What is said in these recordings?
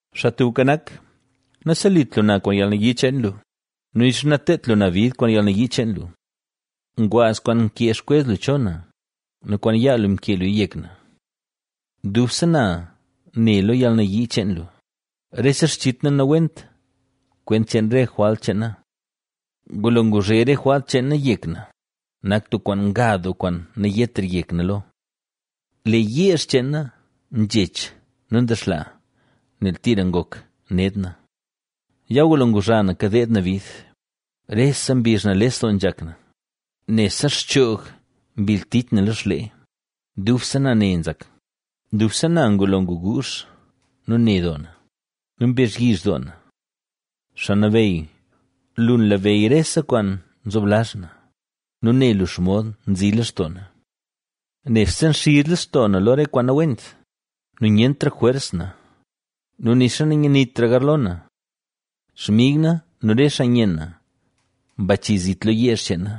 Xaa Tubka Nak, naselit lu na kwaan yalnayii cheen lu nu nixa nateedt lu na bid kwaan yalnayii cheen lu. Ngwaaz kwaan nkee xkwez lu cho na nu kwaan yaa lu mkee luya yek na. Dubse na ne lo yalnayii cheen lu, rese xchit na nawent kwent cheen re jwalt cheen na. Ngulo nguzhe re jwalt cheen na yek na, nak tub kwaan nga doo kwaan nayetra yek na lo. Lee yeezh cheen na nzhech nu ndexlaa, nel tira ngok ned na. Ya ngulo nguzha na kadeed na bid, rese mbizh nales doo nzhak na, nebse xchoog mbil tich na lo xlee, dubse na ne nzak, dubse na ngulo nguguuzh nu ne doo na nu mbezhyizh doo na. Xaa Nabeyy, lu nlabeyy rese kwaan nzoblazh na nu ne lu xomod nzi lextoo na. Nebse nxiz lextoo na lo re kwaan nawent nu nyentra jwers na, nu nixa nanyanitra garlo na. Xmig na nu re xaa nyen na mbachi zit lo yeezh cheen na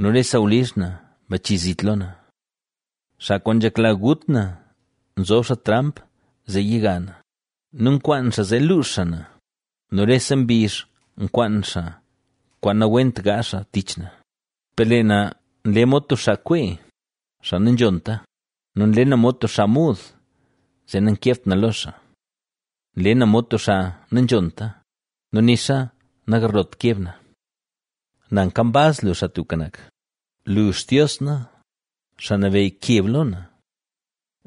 nu re sawlizh na mbachi zit lo na. Xaa kwaan nzhekla gut na nzob xaa tramp zee yiga na nu nkwaan xaa zee luux xaa na, nu rese mbizh nkwaan xaa kwaan nawent gaazh xaa tich na. Per lee na nle mod tub xaa nkwee, xaa nanzhonta nu nle na mod tub xaa muud zee nankebt na lo xaa. Nle na mod tub xaa nanzhonta nu nixa nagarlot keb na. Na, nkambaz lu, Xaa Tubka Nak; lu, Xtios na, Xaa Nabeyy, keb lo na.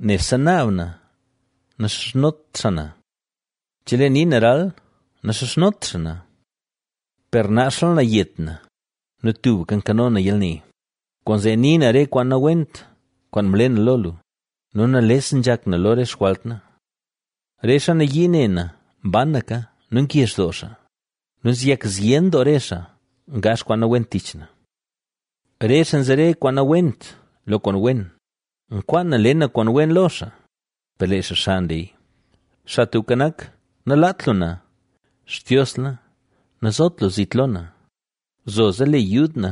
Nebse naab na naxizhnot xaa na, chelee nii na ral, naxizhnot xaa na. Per naxla na yet na nu tubka nkano na yalne, kwaanzee nii na re kwaan nawent kwaan mle na lo lu nu nales nzhak na lo xjwalt na. Re xaa nayii ne na mbanaka nu ngezh doo xaa nu nzeyak zyen doo re xaa ngaazh kwaan nawent tich na. Re xaa nzere kwaan nawent lo kwaan wen, nkwaan na le na kwaan wen lo xaa, per lee xaa xa nleya. Xaa Tubka nak, nalaat lu na, Xtios na, nazot lu zit lo na. ¡Zoza le yud na!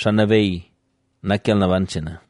¡Xaa Nabeyy, nak yalnaban cheen na!